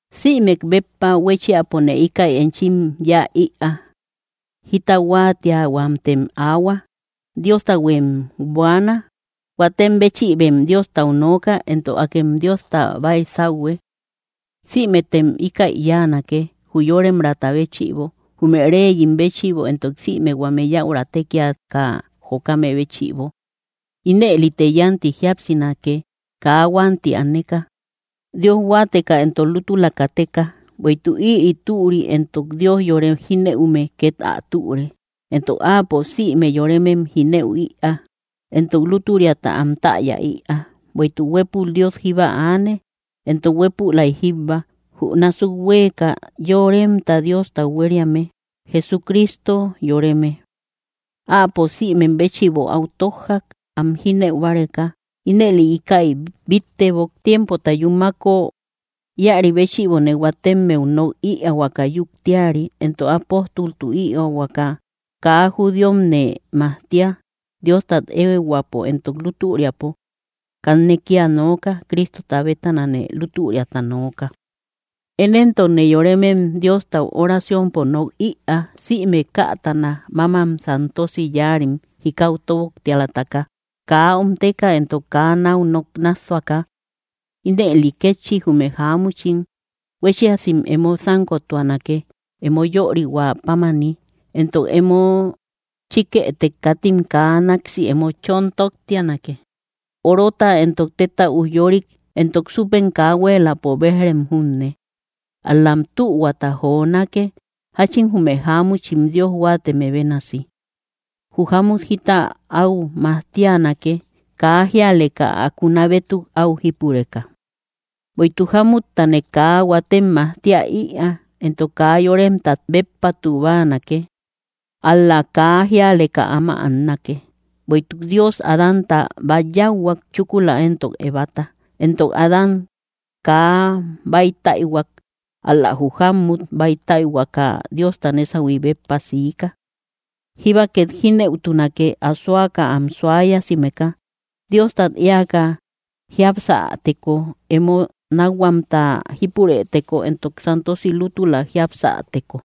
Sïmek béppa huéchiapone íkäi enchim yáa ïa: jita huáatiahuamtem aahua, Diostahuem buaana, huatem béchïbem Diostau nooka, entok akem Diosta baisauhue. Sïmetem íkäi yáanake, jü yóremraata béchïbo, jume reyim béchïbo entok sïme huame yaura tékiaka jokame béchïbo; ínëlite yánti jíapsinake, kaa huanti aneka, Dios huáateka entok lútula kateka. Bueïtuk ïri türi entok Dios yore jínëume két ä türe, entok Áapo sïme yoremem jínëu ïaa, entok lútüriata am täya ïaa. Bueïtuk huépul Dios jíba aane, entok huépülay jíbba, jü násuk huéeka yoremta Diostau huériame, Jesucristo yoreme. Áapo sïmem béchïbo áu tójjak, am jínëu báreka. Ínëli íkäi bíttebok, tiempota yúmako. Íäri béchïbone huatemmeu nok ïaahuaka yuktiari, entok apóstoltu ïaahuaka, kaa judíomne majtia, Diostat éehuäpo entok lútüriapo. Kanne kía nooka, Cristota bétanane lútüriata nooka. Én éntokne yoremem Diostau oraciompo nok ïaa, sïme kätana, mámam santosi yáarim jikau tóboktialataka, kaa omteka entok kaa náu nok nássuaka. Ínëli kétchi, jume jáamuchim huéchiasim emo sánkotuanake, emo yörihuä pámani; entok emo chíkëtek, katim kaa náksi emo chon tottianake, orota entok téta ujyorik entok súpe kaa huéeläpo béj‑rem junne. Ál‑lam tühuata jonake, jáchin jume jáamuchim Dios huáateme bénasi. Jü jámmut jita áu majtianake, kaa jíaleka ä kuna bétuk áu jípureka. Bueïtuk jámuttane kaa huatem majtia ïaa, entok kaa yoremtat béppatu báanake; ál‑la kaa jíaleka áma annake. Bueïtuk Dios Adánta bát yáuhuak, chúkula éntok Evata. Entok Adán kaa bäitaïhuak, ál‑la jü jámmut báitaütaka Diosta nésahui béppa siika. Jíba két jínëutunake, asoaka am suayasimeka, Diostat éaka jiapsäteko, emo nákhuamta jípurëteko, entok santosi lútula jiapsäteko.